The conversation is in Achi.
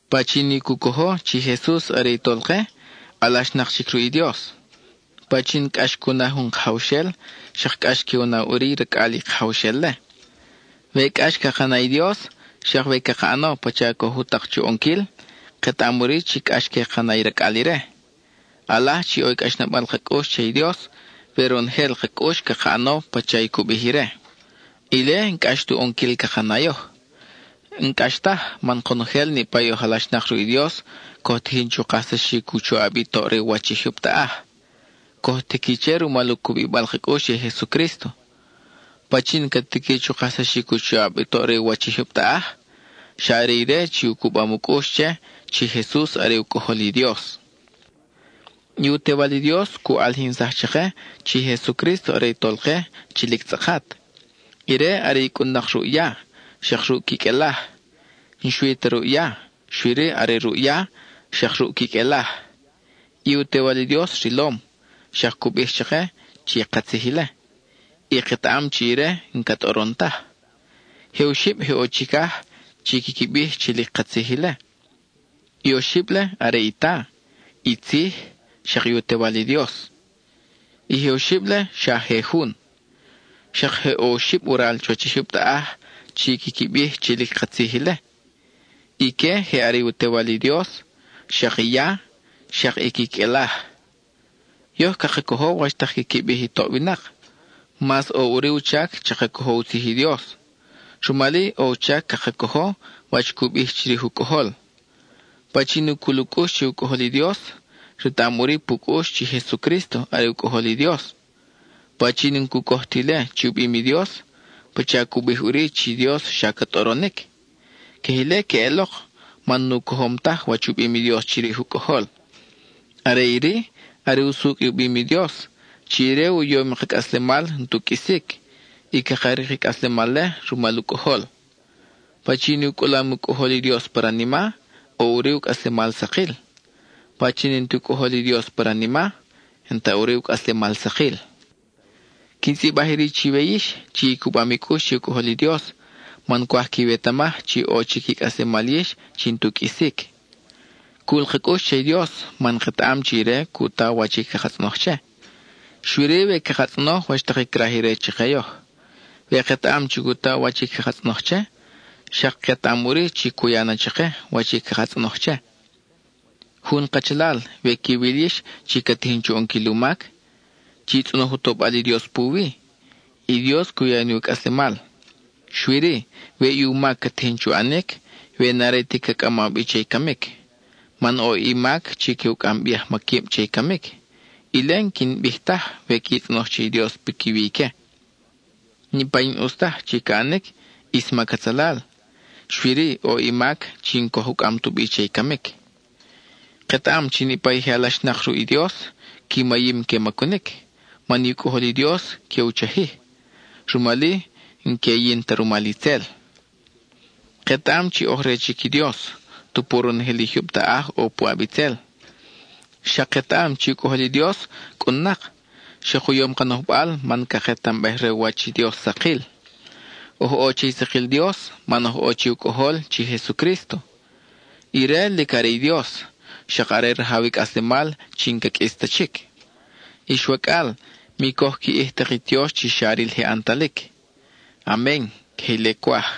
Pachin i cu cojo chi i Jesus are i Tolke, alaxnak chic ruʼ i Dios. Pachin cʼax cu na jun kajawxel, xak cʼax que u na ʼuri i racʼal i kajawxel-le. We cʼax caka na i Dios, xak we caka ʼano pacha coj u tak chu ʼonquil, ketaʼam ʼuri chi cʼax que ka na i racʼal ire. ʼAlaj chi ʼo i cʼaxnabal ka cʼux che i Dios we ronojel ka cʼux caka ʼano pacha i cu bij ire; ile n-cʼax tu ʼonquil caka na yoj. N-cʼax taj, man konojel niʼpa i oj alaxnak ruʼ i Dios coj tiqui chu kajsaxic u choʼab i toʼ re u wach i jyub taʼaj. Coj tiqui che rumal u cubibal ka cʼux che i Jesucrísto. ¿Pachin ca tiqui chu kajsaxic u choʼab i toʼ re u wach i jyub taʼaj? Xa are ire chi u cubam u cʼux che, chi Jesus are u Cʼojol i Dios. I u Tewal i Dios cu ʼalijinsaj chake chi Jesucrísto are i Tolke chi lic tzʼakat. Ire are i cʼun-nak ruʼ ya, xak ruʼ quiqʼuelaj; n-xui ta ruʼ ya, xui-ri are ruʼ ya, xak ruʼ quiqʼuelaj. I u Tewal i Dios rilom, xak cu bij chake chi katzij ile, y ketaʼam chi ire n-ca tʼoron taj. Je oxib je ʼo chicaj chi quiqui bij chi lic katzij ile; i oxib-le are i Ta, i Tzij, xak i u Tewal i Dios. I je oxib-le xa je jun. Xak je ʼo oxib waral chuwach i jyub taʼaj chi quiqui bij chi lic katzij ile; ique je are i u Tewal i Dios, xak i ya, xak i quiqʼuelaj. Yoj caka cojo wach tak quiqui bij i toʼ winak, mas ʼo ʼuri u chac chaka cojo u tzij i Dios; rumal-i ʼo u chac caka cojo wach cu bij chirij u Cʼojol. Pachin i cul u cʼux che u Cʼojol i Dios, retaʼam ʼuri pu cʼux chi Jesucrísto are u Cʼojol i Dios. Pachin n-cu coj ti ile chi u bim i Dios, pacha cu bij ʼuri chi Dios xa ca tʼoronic. Queje ile queʼelok, man nu cojom taj wach u bim i Dios chirij u Cʼojol. Are iri, are usucʼ i u bim i Dios, chi ire u yom i ka cʼaslemal n-tu qʼuisic, y caka rik i cʼaslemal-le rumal u Cʼojol. Pachin i u cʼulam u Cʼojol i Dios pa ranima, ʼo ʼuri u cʼaslemal sakil; pachin i n-ti u Cʼojol i Dios pa ranima, n-ta ʼuri u cʼaslemal sakil. Quin tzʼibaj iri chiwe yix, chi i cubam i cʼux che i u Cʼojol i Dios, man cwaj quiwetamaj chi ʼo chic i cʼaslemal yix chi n-tu qʼuisic. Cul ka cʼux che i Dios man ketaʼam chi ire cu ta wach i caka tzʼonoj che, xui-ri we caka tzʼonoj wach tak i craj ire chake yoj. We ketaʼam chi cu ta wach i caka tzʼonoj che, xak ketaʼam ʼuri chi cu ya na chake wach i caka tzʼonoj che. Jun kachalal, we quiwil yix chi ca tijin chu ʼonquil u mac, chi tzʼonoj u tobal i Dios puwi, y Dios cu ya ni u cʼaslemal, xui-ri, we i u mac ca tijin chu ʼanic we n-are ta ca cʼamaw bi che i camic. Man ʼo i mac chi que u cʼam bi ajmaquib che i camic; ile n-quin bij taj we qui tzʼonoj che i Dios piquiwi ique. Niʼpa i n-ʼus taj chi ca ʼanic, ʼis mac atzalal, xui-ri ʼo i mac chi n-coj u cʼam tu bi che i camic. Ketaʼam chi niʼpa i je alaxnak ruʼ i Dios, qui mayim que macunic, man i u Cʼojol i Dios que u chajij; rumal-i n-que yin ta rumal itzel. Ketaʼam chi oj re chic i Dios, tupu ronojel i jyub taʼaj ʼo puʼab itzel. Xak ketaʼam chi u Cʼojol i Dios cʼun-nak, xak u yom ka nojbal man caketambej re u wach i Dios sakil. Oj ʼo che i sakil Dios, man oj ʼo che u Cʼojol chi Jesucrísto. Ire lic are i Dios, xak are rajaw i cʼaslemal chi n-ca qʼuis ta chic. Ix wacʼal, mi coj qui ʼij tak i tiox chi xa ril je ʼantalic. Amen (queje ile cwaj).